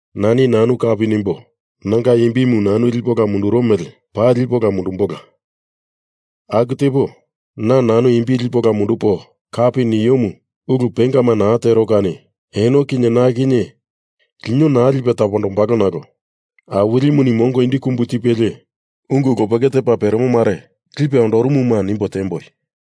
Nani nanu kapi nimbo nanga imbimu nanu lipo ola munduro mele paa lipo ola mundumbola. Aku tepo, na nanu imbi lipo ola mundupo kapi niomu ulu pengama naa tero kani eno kinye na kinye lino naa lipe tapondombalo nalo Awilimuni mongo indi kumbu tipelie ungu lopeke tepa peremo mare lipe ondorumuma nimbo tiemboi.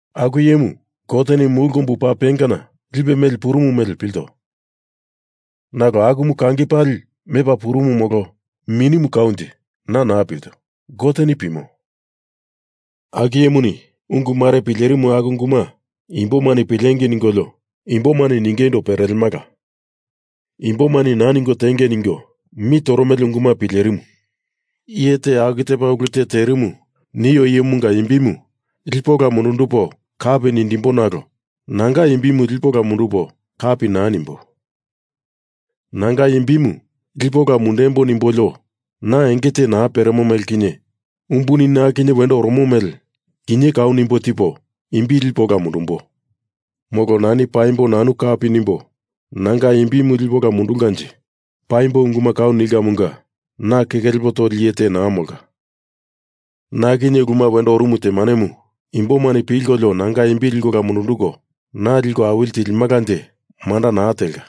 Aku iyemu, Goteni mulu kombu paa pengana lipe meli purumu mele pilto, nalo akumu kangi pali mepa purumu molo minimu kaunje, na naa pilto. Goteni pimo. Aku iyemuni ungu mare pilerimu aku unguma imboma pilengei ningolio imbomani ningeindo perelemala. Imbomani naa ningo tiengei ningo mi toromele unguma pilerimu. Iye te aku tepa ulu te terimu nio iyemunga imbimu lipo ola mundundupo kapi nindimbo nalo nanga imbimu lipo ola mundupo kapi naa nimbo. Nanga imbimu lipo ola mundembo nimbolio na enge te naa peremo mele kinye umbuni na kinye wendo oromo mele kinye kau nimbo tipo imbi lipo ola mundumbo. Molo nani paimbo nanu kapi nimbo nanga imbi lipo ola mundulkanje, paimbo unguma kau nilkamunga na keke lepo toli iye te naa molka. Na kinye uluma wendo orumu temanemu imbomani pilkolio nanga imbi liko ola mundunduko na liko awili tilimalanje manda naa telka.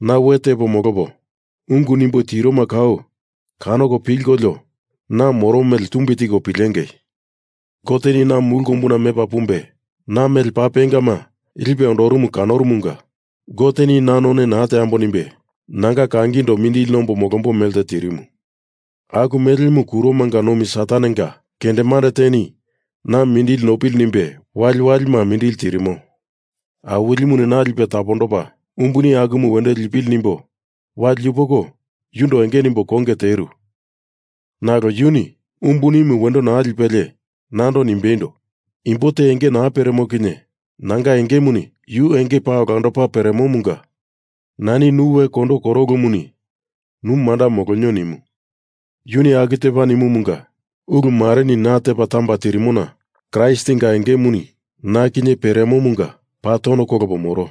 Na we tepo molopo ungu nimbo tiroma kau kanoko pilkolio na moro mele tumbi tiko pilengei. Goteni na mulu kombuna mepa pumbe na mele paa pengama lipe ondorumu kanorumunga Goteni na none naa teambo nimbe nanga kangindo mindili nombo molombo melte tirimu. Aku melemu kuromanga nomi Satanenga kendemande teni na mindili nopili nimbe waliwalima mindili tirimo. Awilimuni na lipe tapondopa umbuni akumu wendo lindipili nimbo wali yupoko yundo enge nimbo konge teru, nalo yuni umbunimu wendo naa lipelie nando nimbeindo, imbo te enge naa peremo kinye nanga engemuni yu enge paa olandopa peremomunga nani nu we kondo koro ulumuni nu manda molonio nimu. Yuni aku tepa nimumunga ulu mareni na tepa tamba tirimona Kraistinga engemuni na kinye peremomunga paa tono kolopo moro.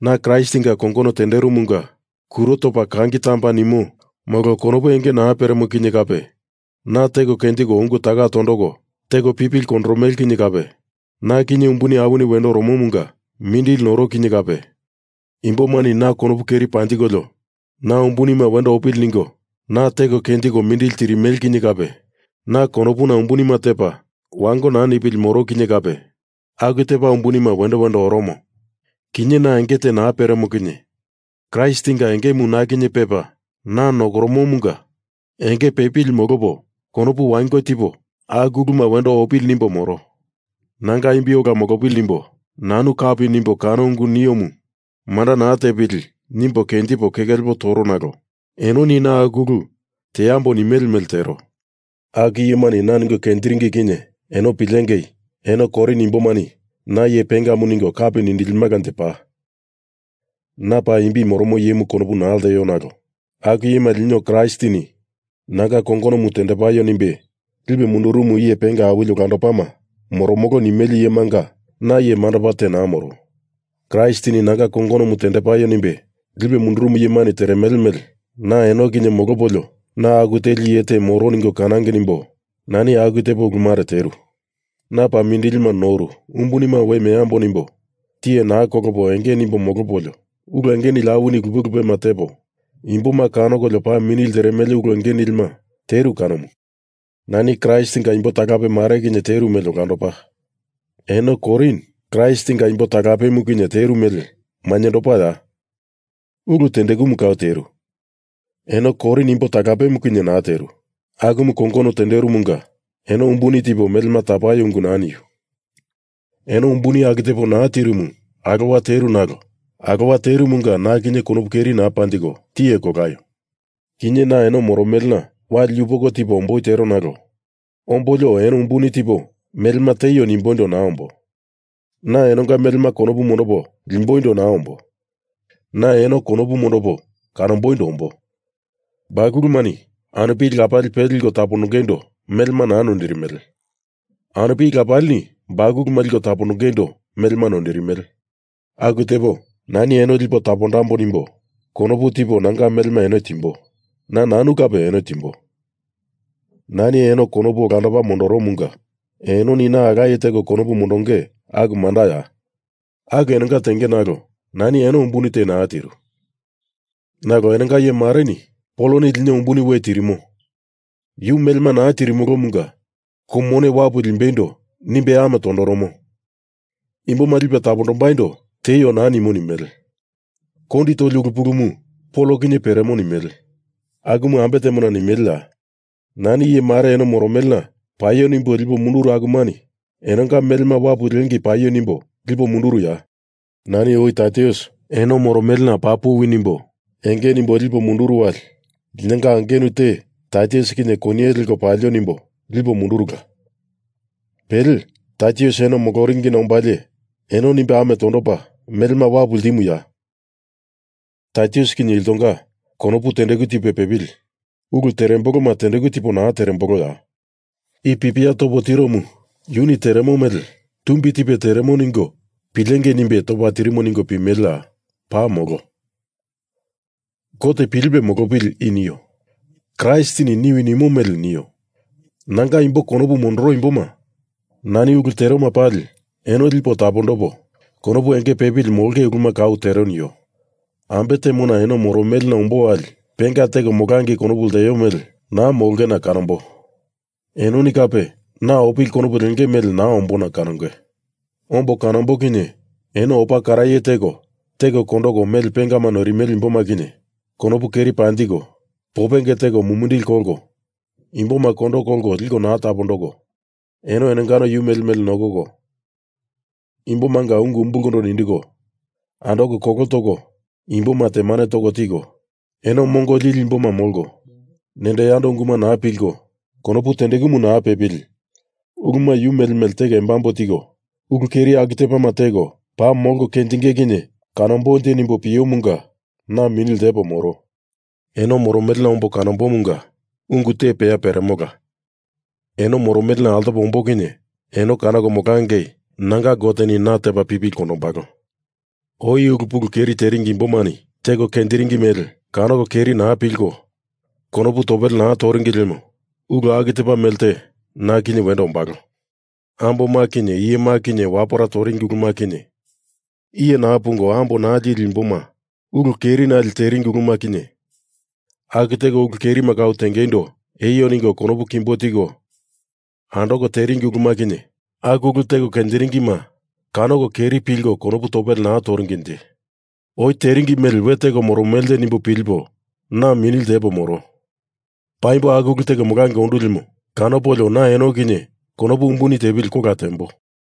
Na Kraistinga kongono tenderomunga kuro topa kangi tamba nimo molo konopu enge naa peremo kinye kape, na teko kenjiko ungu taka tondoko teko pipili kondoromele kinye kape, na kinye umbuni awini wendo oromomunga mindili noro kinye kape, imbomani na konopu keri panjikolio na umbunima wendo opili ningo na teko kenjiko mindili tirimele kinye kape, na konopuna umbunima tepa wango naa nipili moro kinye kape, aku tepa umbunima wendo wendo oromo kinye na enge te naa peremo kinye, Kraistinga engemu na kinye pepa na nokoromomunga enge pepili molopo konopu wango tipo aku uluma wendo opili nimbo moro. Nanga imbi ola molopili nimbo nanu kapi nimbo kano ungu niomu manda naa tepili, nimbo kenjipo keke lepo toro nalo enoni na aku ulu teambo nimele mele tero. Aku iyemani na ningo kenjiringi kinye eno pilengei eno Korin imbomani na iye pengamu ningo kapi nindilimalanje paa. Na paa imbi moromo iyemu konopu naa lteo nalo aku iyema lino Kraistini nanga kongonomu tendepaio nimbe lipe mundurumu iye penga awili olandopama moromolo nimele iyemanga na iye mandopa te naa moro. Kraistini Nanga kongonomu tendepaio nimbe lipe mundurumu iyemani teremele mele na eno kinye molopolio na aku teli iye te moromo ningo kanangei nimbo nani aku tepo ulu mare teru. Na paa mindili noru umbunima we meambo nimbo tiye naa kolopo enge nimbo molopolio, ulu enge nili awini lupe lupema tepo, imboma kanokolio paa mini lteremele ulu enge nilima teru kanomu. Nani Kraistinga imbo talape mare kinye teru mele olandopa, eno Korin Kraistinga imbo talapemu kinye teru mele mainyendopaya? Ulu tendekumu kau teru, eno Korin imbo talapemu kinye naa teru, akumu kongono tenderumunga eno umbuni tipo melema tapaio ungu naa niu. Eno umbuni aku tepo naa tirumu alowa teru nalo alowa terumunga na kinye konopu keri naa panjiko, tiye kolaio. Kinye na eno moromelena wali yupoko tipo omboi tero nalo ombolio eno umbuni te tipo melema tieio nimboindo naa ombo. Na enonga melema konopu mondopo limboindo naa ombo. Na eno konopu mondopo kanomboindo ombo. Bakulumani anupili lapali pele liko tapondongeindo melema naa noindirimele; anupili lapalini bakuluma liko tapondongeindo melema noindirimele. Aku tepo, nani eno lipo tapondambo nimbo konopu tipo nanga melema eno timbo, na nanu kape eno timbo. Nani eno konopu olandopa mondoromunga enoni na alaye teko konopu mondonge aku mandaya? Aku enonga tenge nalo nani eno umbuni te naa tiru. Nalo enonga iye mareni Poloni lino umbuni we tirimo, yu melema naa tirimolomunga kou mone wapu limbeindo nimbe amo tondoromo, imboma lipe tapondombaindo tieio naa nimo nimele. Kondi toli ulu pulumu Pol kinye peremo nimele. Akumu ambe temona nimeleya? Nani iye mare eno moromelena paio nimbo lipo munduru akumani enonga melema wapu liengei paio nimbo lipo munduruya? Nani oi Taitus eno moromelena paa puwi nimbo enge nimbo lipo munduru wali linonga angenu te Taitus kinye koniye leko palio nimbo lipo mundurula. Pele, Taitus eno moloringina ombalie eno nimbe amo tondopa melema wapu ltimuya? Taitus kinye iltonga konopu tendeku tipe pepili ulu teremboloma tendeku tipo naa teremboloya? I pipia topo tiromu yuni teremo mele tumbi tipe teremo ningo pilengei nimbe topa tirimo ningo pimeleya? Paa molo! Gote pilipe molopili i nio. Kraistini niwi nimo mele nio. Nanga imbo konopu mondoro imboma, nani ulu teroma pali eno lipo tapondopo konopu enge pepili molonge uluma kau tero nio. Ambe temona eno moromelena ombo wali penga teko molangei konopu lteo mele naa molongena kanambo. Enoni kape na opili konopu lenge mele naa ombona kanonge. Ombo kanombo kinye eno opa karaye teko, teko kondoko mele pengama noirimele imboma kinye konopu keri panjiko, popenge teko mumindili kolko, imboma kondo kolko liko naa tapondoko eno enongano yu mele mele nokoko, imbomanga ungu umbulkondo nindiko, andoko kolo toko imboma temane toko tiko, eno mongo lili imboma molko, nendo yando unguma naa pilko konopu tendekumu naa pepili uluma yu mele mele teko embambo tiko, ulu keri aku tepama teko paa molko kenjinge kinye kanombonje nimbo piomunga na mini ltepo moro. Eno moromelena ombo kanombomunga ungu te peya peremola. Eno moromelena altopo ombo kinye eno kanoko molangei nanga Goteni na tepa pipili kondombalo. Oi ulu pulu keri teringi imbomani teko kenjiringi mele kanoko keri naa pilko konopu topele naa toringi lemo ulu aku tepa mele te na kinye wendo ombalo. Amboma kinye iyema kinye wapera toringi uluma kinye, iye naa pungo ambo naa lili imboma ulu kerinali teringi uluma kinye, aku teko ulu kerima kau tengeindo eio ningo konopu kimbo tiko andoko teringi uluma kinye, aku ulu teko kenjiringima kanoko keri pilko konopu topele naa toringinje. Oi teringi mele we teko moromelenje nimbo pilipo na mini ltepo moro. Paimbo aku ulu teko molangei ondu lemo kanopolio na eno kinye konopu umbuni tepili kola tembo.